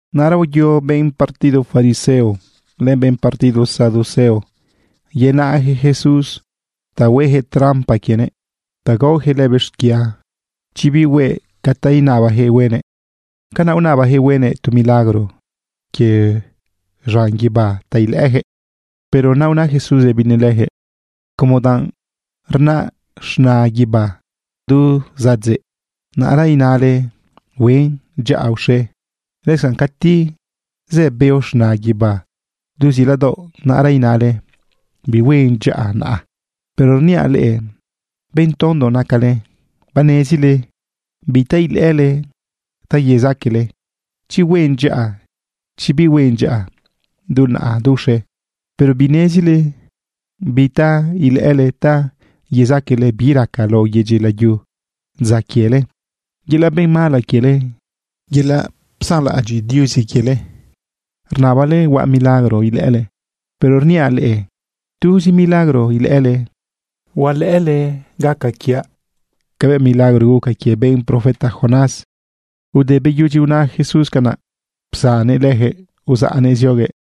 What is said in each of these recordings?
Naꞌra uyo benꞌ partido fariseo, len benꞌ partido saduceo yenaꞌjëꞌ Jesús ta huejëꞌ trampa quienëꞌ ta gaojëꞌ lëbëꞌ xquia chi bihue ca ta inabajëꞌ huenëꞌ. Canaꞌ unabajëꞌ huenëꞌ tu milagro quie z̃an guibá ta ilëꞌëjëꞌ. Pero naꞌ una Jesús rëbinëꞌ lëjëꞌ: ―Como danꞌ rnaꞌ z̃na guibá du zadzeꞌ, naꞌra inale: “Huen dyaꞌa uxe.” Lëscanꞌ cati zë beo z̃na guibá du ziladaoꞌ, naꞌra inale: “Bihuen dyaꞌa naꞌa.” Pero rniaꞌ leꞌe, benꞌ tondo nacale. Banezile bi ta ilëꞌële ta yezaqueꞌle chi huen dyaꞌa, chi bihuen dyaꞌa, du naꞌa, du uxe. Pero binezile bi ta ilëꞌële ta yezaqueꞌle bi raca lao yedyi layu dza quiele. Yelaꞌ benꞌ mala quiele, yelaꞌ psanlaꞌadyiꞌ Diuzi quiele, rnabale huaꞌ milagro ilëꞌële. Pero rniaꞌ leꞌe, tuzi milagro ilëꞌële, huelëꞌële gaca quiaꞌ cabëꞌ milagro guca quie benꞌ profeta Jonás. Te beyudyi una Jesús canaꞌ, psannëꞌ lëjëꞌ uzaꞌnëꞌ zioguëꞌ.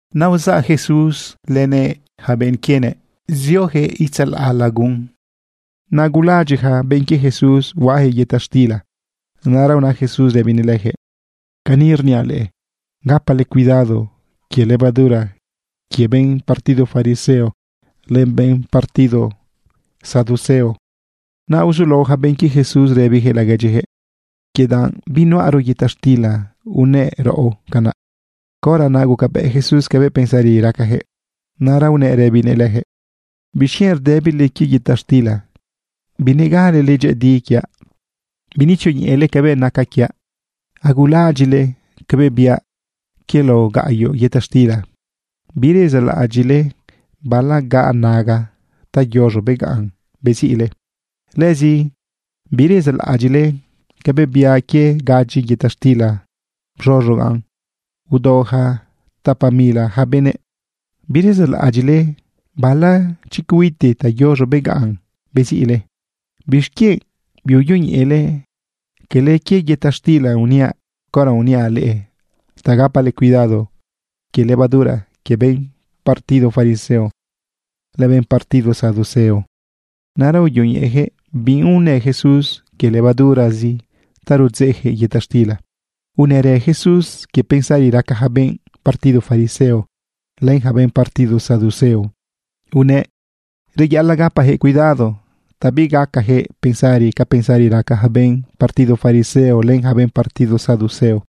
Naꞌ uzaꞌ Jesús lënëꞌ yaca benꞌ quienëꞌ ziojëꞌ itzalaꞌ lagun. Naꞌ agulaꞌadyiꞌ ja benꞌ quie Jesús huaꞌajëꞌ yëta xtila. Naꞌra una Jesús rëbinëꞌ lëjëꞌ: ―Cani rniaꞌ leꞌe, gapale cuidado quie levadura quie benꞌ partido fariseo len benꞌ partido saduceo. Naꞌ uzulao ja benꞌ quie Jesús rëbijëꞌ laguedyijëꞌ: ―Quie danꞌ binuꞌaro yëta xtila unëꞌ raꞌo canaꞌ. Caora naꞌ gucabëꞌ Jesús cabëꞌ pensari racajëꞌ, naꞌra unëꞌ rëbinëꞌ lëjëꞌ: ―¿Bixquienꞌ rdëbile quie yëta xtila? ¡Binegalele dyëꞌëdi quiaꞌ! ¿Binetzioñeꞌele cabëꞌ naca quiaꞌ? ¿Agulaꞌadyiꞌle cabëꞌ biaꞌ quie lao gaꞌyoꞌ yëta xtila? ¿Birezaꞌlaꞌadyiꞌle bala gaꞌ naga ta yoz̃o begaꞌn beziꞌle? ¿Lëzi birezaꞌlaꞌadyiꞌle cabëꞌ biaꞌ quie gadyi yëta xtila bz̃oz̃ogaꞌn udao ja tapa mila ja benëꞌ? ¿Birezaꞌlaꞌadyiꞌle bala chicuiti ta yoz̃o begaꞌn beziꞌle? ¿Bixquienꞌ biuyoñeꞌele quele quie yëta xtila uniaꞌ caora uniaꞌ leꞌe ta gapale cuidado quie levadura quie benꞌ partido fariseo len benꞌ partido saduceo? Naꞌra uyoñeꞌejëꞌ biunë Jesús quie levadurazi ta rudzeꞌjëꞌ yëta xtila. Unërë Jesús quie pensari raca ja benꞌ partido fariseo len ja benꞌ partido saduceo. Unëꞌ reyaꞌalaꞌ gapajëꞌ cuidado ta bigacajëꞌ pensari ca pensari raca ja benꞌ partido fariseo len ja benꞌ partido saduceo.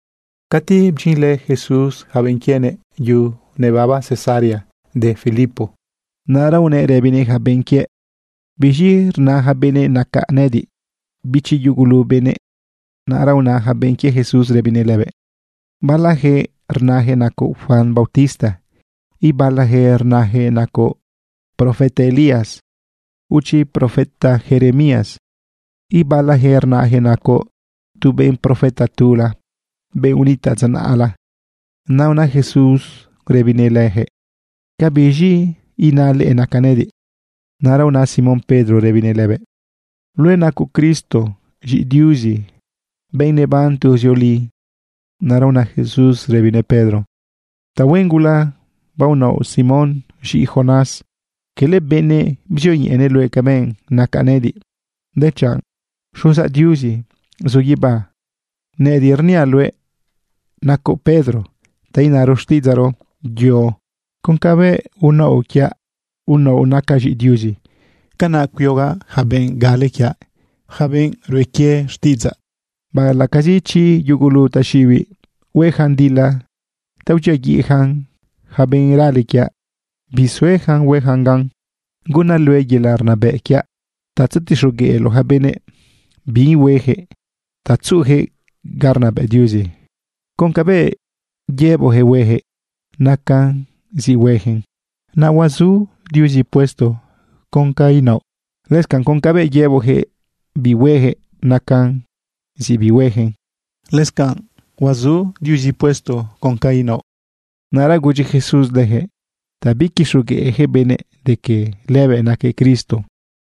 Cati bdyinlë Jesús yaca benꞌ quienëꞌ yu nebaba Cesarea de Filipo, naꞌra unëꞌ rëbinëꞌ ja benꞌ quiëꞌ: ―¿Biz̃i rna ja benëꞌ nacaꞌ nëꞌëdiꞌ, bichi yugulu benëꞌ? Naꞌra una ja benꞌ quie Jesús rëbinëꞌ lëbëꞌ: ―Balajëꞌ rnajëꞌ nacoꞌ Juan bautista. Ibalajëꞌ rnajëꞌ nacoꞌ profeta Elías, o chi profeta Jeremías. Ibalajëꞌ rnajëꞌ nacoꞌ tu benꞌ profeta tula, benꞌ unitaꞌ dza naꞌla. Naꞌ una Jesús rëbinëꞌ lëjëꞌ: ―¿Cabiz̃i ina leꞌe nacaꞌ nëꞌëdiꞌ? Naꞌra una Simón Pedro rëbinëꞌ lëbëꞌ: ―Luëꞌ nacoꞌ Cristo, z̃iꞌi Diuzi, benꞌ neban tuzioli. Naꞌra una Jesús rëbinëꞌ Pedro: ―Tahuen gula baonaoꞌ, Simón, z̃iꞌi Jonás. Quele benëꞌ bzioñeꞌenëꞌ luëꞌ cabëꞌ nacaꞌ nëꞌëdiꞌ, dechanꞌ Xuzaꞌ Diuzi zu guibá. Nëꞌëdiꞌ rniaꞌ luëꞌ nacoꞌ Pedro, ta inaro xtiꞌidzaꞌro “yo”. Con cabëꞌ unaoꞌ quiaꞌ unaoꞌ nacaꞌ z̃iꞌi Diuzi, canaꞌ cuiogaꞌ yaca benꞌ gale quiaꞌ, yaca benꞌ rue quie xtiꞌidzaꞌ. Baꞌalaꞌcazi chi yugulu taxiꞌibiꞌ huejan dila ta udyiaguiꞌjan ja benꞌ rale quiaꞌ, bisuejan huejan gan. Gunaꞌ luëꞌ yelaꞌ rnabëꞌ quiaꞌ ta tzetixogueꞌloꞌ ja benëꞌ bi huejëꞌ ta tzuꞌujëꞌ ga rnabëꞌ Diuzi. Con cabëꞌ yëboꞌjëꞌ huejëꞌ, nacan zi huejëꞌn, naꞌ huazu Diuzi puesto con ca inaoꞌ. Lëscanꞌ con cabëꞌ yëboꞌjëꞌ bihuejëꞌ, nacan zi bihuejëꞌn, naꞌ lëscanꞌ huazu Diuzi puesto con ca inaoꞌ. Naꞌ ra gudyi Jesús lëjëꞌ ta biquixogueꞌjëꞌ benëꞌ de que lëbëꞌ naquëꞌ Cristo.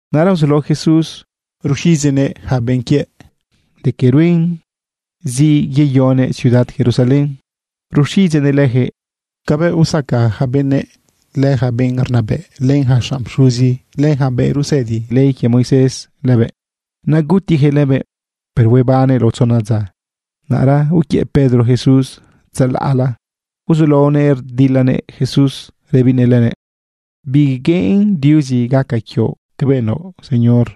Naꞌra uzulao Jesús ruxiꞌidzeꞌnëꞌ yaca benꞌ quiëꞌ de que ruen zi yeyonëꞌ ciudad Jerusalén. Ruxiꞌidzeꞌnëꞌ lëjëꞌ cabëꞌ usaca yaca benëꞌ, len ja benꞌ rnabëꞌ, len ja xanꞌ pxuzi, len ja benꞌ rusëdi ley quie Moisés lëbëꞌ, naꞌ gutijëꞌ lëbëꞌ, pero huebannëꞌ lao tzona dza. Naꞌra uquiëꞌ Pedro Jesús tzalaꞌla uzulaonëꞌ rdilanëꞌ Jesús rëbinëꞌ lëbëꞌ: ―¡Bigueꞌen Diuzi gaca quioꞌ cabëꞌ naoꞌ, Señor!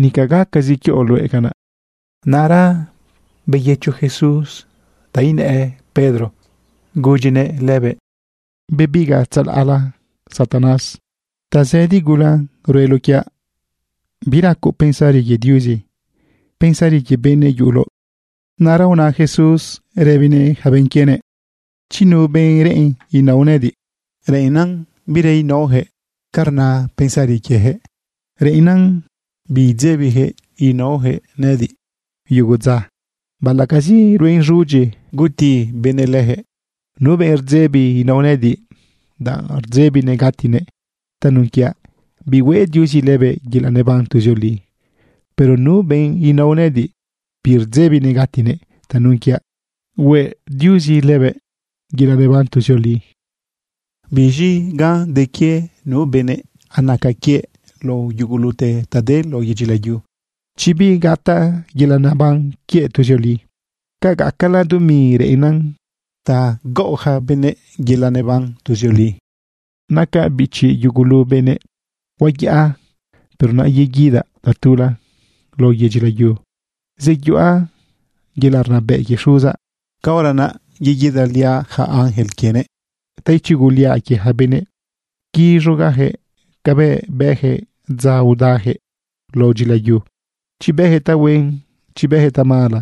¡Nica gacazi quioꞌ luëꞌ canaꞌ! Naꞌra uyëcho Jesús ta inë Pedro laohuëꞌ rëbinëꞌ lëbëꞌ: ―Bebigaꞌ tzalaꞌla, Satanás. Tazëdi gula rueloꞌ quiaꞌ. Biracoꞌ pensari quie Diuzi. Pensari quie benëꞌ yuꞌuloꞌ. Naꞌra una Jesús rëbinëꞌ ja benꞌ quienëꞌ: ―Chi nu benꞌ reꞌen inao nëꞌëdiꞌ, reꞌennan bira inaoyaquëꞌ ca rna pensari quieyaquëꞌ. Reꞌennan bidzebiyaquëꞌ naoyaquëꞌ nëꞌëdiꞌ yugu dza, baꞌalaꞌcazi ruen z̃udyi guti benëꞌ leyaquëꞌ. Nu benꞌ rdzebi inao nëꞌëdiꞌ, danꞌ rdzebinëꞌ gatinëꞌ tanun quiaꞌ, bihueꞌ Diuzi lëbëꞌ yelaꞌ neban tuzioli. Pero nu benꞌ inao nëꞌëdiꞌ birdzebinëꞌ gatinëꞌ tanun quiaꞌ, hueꞌ Diuzi lëbëꞌ yelaꞌ neban tuzioli. ¿Biz̃i gan de quie nu benëꞌ anaca quie lao yugulute ta de lao yedyi layu, chi bigataꞌ yelaꞌ neban quiëꞌ tuzioli? ¿Ca gacala dumi reꞌennan ta gaꞌo yaca benëꞌ yelaꞌ naban tuzioli? Nacaꞌ bichi yugulu benëꞌ. Huayaꞌa, pero naꞌ yeguidaꞌ tatula lao yedyi layu, zeyuꞌa yelaꞌ rnabëꞌ quie Xuzaꞌ. Caora naꞌ yeguidaliaꞌ yaca ángel quienëꞌ ta ichuguliaꞌ quie ja benëꞌ, quiz̃ogaꞌjëꞌ cabëꞌ bëjëꞌ dza udajëꞌ lao dyilayu, chi bëjëꞌ tahuen, chi bëjëꞌ tamala.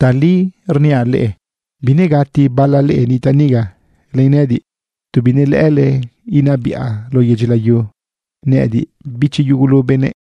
Tali rniaꞌ leꞌe, binegati bala leꞌe nitaꞌ niga len nëꞌëdiꞌ tu binelëꞌë inabiꞌa lao yedyi layu, nëꞌëdiꞌ bichi yugulu benëꞌ.